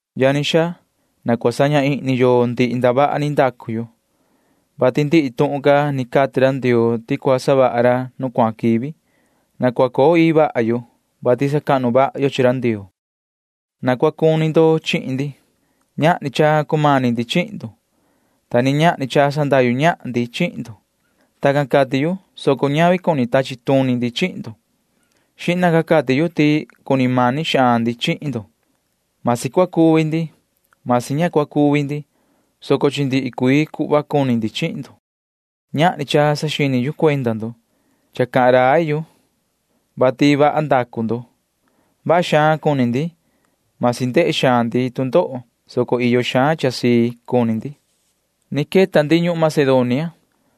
Yani xaa, na cua saña ihni yo ndihi ndavaha ni ndacu yo, vati ndihi tuhun can ni cati ra Ndioo ti cua savaha ra nu cuahan quivi. Na cua coo ii vaha yo, vati sacahnu vaha yo chi ra Ndioo. Na cua cuni ndo chihin ndi. Ñahni cha cumani ndi chihin ndo, ta ni ñahni cha sandahyu ñahan ndi chihin ndo. Tacan cati yu, soco ñavi ti cuni tachi tuni ndi chihin ndo. Xihna ca cati yu ti cuni mani xaan ndi chihin ndo. Masi cua cuvi ndi, masi ña cua cuvi ndi, soco chi ndihi cuii cuhva cuni ndi chihin ndo. Ñahni cha saxini yu cuenda ndo. Cha cahan rai yu, vati vaha ndacu ndo. Vaha xaan cuni ndi. Masi ndehe xaan ndi tu ndoho, soco iyo xaan cha sii cuni ndi. Ni queta ndi ñuhun Macedonia,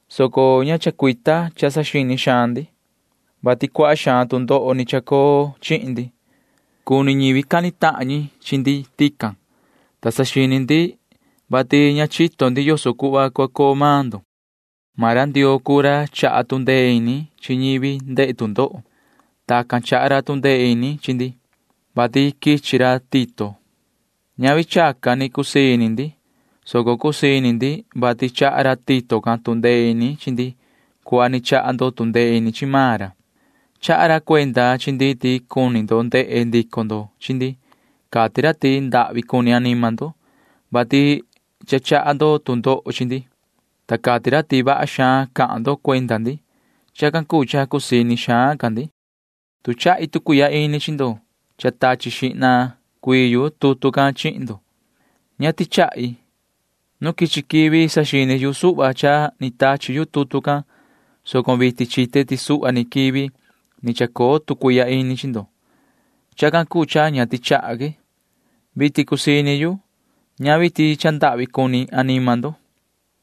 soco ña chacuita cha saxini xaan ndi, vati cuaha xaan tu ndoho ni chacoo chihin ndi. Cuni ñivi cani tahan ñi chi ndi tican, ta saxini ndi, vati ña chito ndi yoso cuhva cua coo maan ndo. Maan ra Ndioo cuu ra chaha tu ndee ini chi ñivi ndehe tu ndoho. Tacan chaha ra tu ndee ini chi ndi, vati quichi ra Tito. Ñavi chacan ni cusii ini ndi, soco cusii ini ndi, vati chaha ra Tito can tu ndee ini chi ndi cuhva ni chaha ndo tu ndee ini chi maan ra. Chaha ra cuenda chi ndi ti cuni ndo ndehe ndico ndo chi ndi. Cati ra ti ndahvi cuni anima ndo, vati cha chaha ndo tu ndoho chi ndi, ta cati ra ti vaha xaan cahan ndo cuenda ndi. Chacan cuu cha cusii ini xaan ca ndi. Tu chahi tu cuihya ini chi ndo cha tachi xihna cuii yu tutu can chihin ndo, ña tichahi. Nu quichi quivi saxini yu suhva cha ni tachi yu tutu can, soco vitin chite ti suhva ni quivi ni chacoo tu cuihya ini chi ndo. Chacan cuu cha ña tichaha que. Vitin cusii ini yu. Ñavi ti cha ndahvi cuni anima ndo,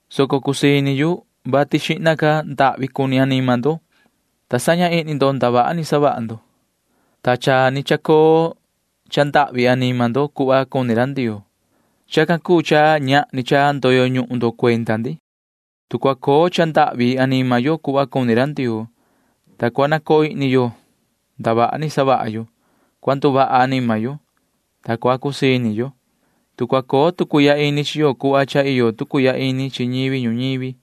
soco cusii ini yu, vati xihna ca ndahvi cuni anima ndo, ta saña ihni ndo ndavaha ni savaha ndo, ta cha ni chacoo cha ndahvi anima ndo cuhva cuni ra Ndioo. Chacan cuu cha ñahni cha ndoyo ñuhun ndo cuenda ndi. Tu cua coo cha ndahvi anima yo cuhva cuni ra Ndioo, ta cua nacoo ihni yo ndavaha ni savaha yo, cua nduvaha anima yo, ta cua cusii ini yo. Tu cua coo tu cuihya ini chi yo cuhva cha iyo tu cuihya ini chi ñivi ñuñivi,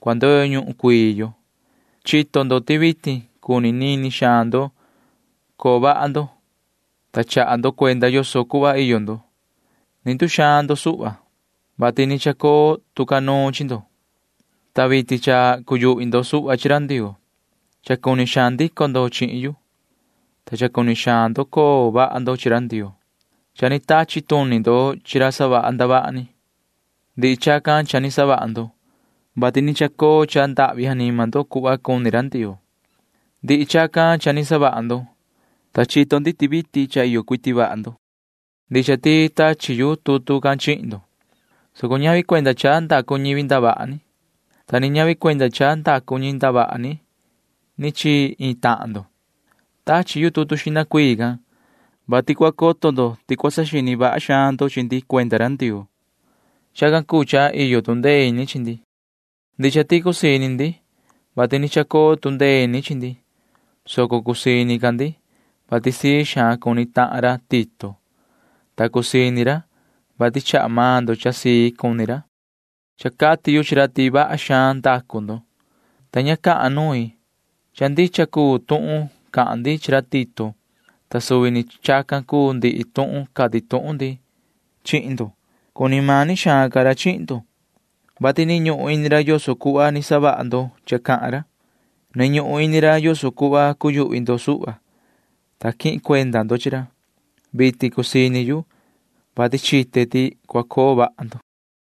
cua ndoyo ñuhun cuii yo. Chito ndo ti vitin cuni nini xaan ndo coo vaha ndo, ta chaha ndo cuenda yoso cuhva iyo ndo. Ni nduxaan ndo suhva, vati ni chacoo tu ca nuun chi ndo, ta vitin cha cuyuhvi ndo suhva chi ra Ndioo. Cha cuni xaan ndico ndo chihin yu, ta cha cuni xaan ndo coo vaha ndo chi ra Ndioo. Cha ni tachi tuni ndo chi ra savaha ndavaha ni. Ndihi chacan cha ni savaha ndo, vati ni chacoo cha ndahvi anima ndo cuhva cuni ra Ndioo. Ndihi chacan cha ni savaha ndo, ta chito ndi ti vitin cha iyo cuiti vaha ndo. Ndicha ti tachi yu tutu can chihin ndo, soco ñavi cuenda cha ndacu ñivi ndavaha ni, ta ni ñavi cuenda cha ndacu ñi ndavaha ni chi iin tahan ndo. Tachi yu tutu xihna cuii can, vati cua coto ndo ti cua saxini vaha xaan ndo chi ndi cuenda ra Ndioo. Chacan cuu cha iyo tu ndee ini chi ndi. Ndicha ti cusii ini ndi, vati ni chacoo tu ndee ini chi ndi, soco cusii ini ca ndi, vati sii xaan cuni tahan ra Tito, ta cusii ini ra, vati chaha maan ndo cha sii cuni ra. Cha cati yu chi ra ti vaha xaan ndacu ndo, ta ña cahan nuin. Cha ndicha cuu tuhun cahan ndi chi ra Tito, ta suvi ni chacan cuu ndihi tuhun cati tuhun ndi chihin ndo. Cuni mani xaan ca ra chihin ndo, vati ni ñuhun ini ra yoso cuhva ni savaha ndo cha cahan ra. Ni ñuhun ini ra yoso cuhva cuyuhvi ndo suhva, ta quihin cuenda ndo chi ra. Vitin cusii ini yu, vati chite ti cua coo vaha ndo.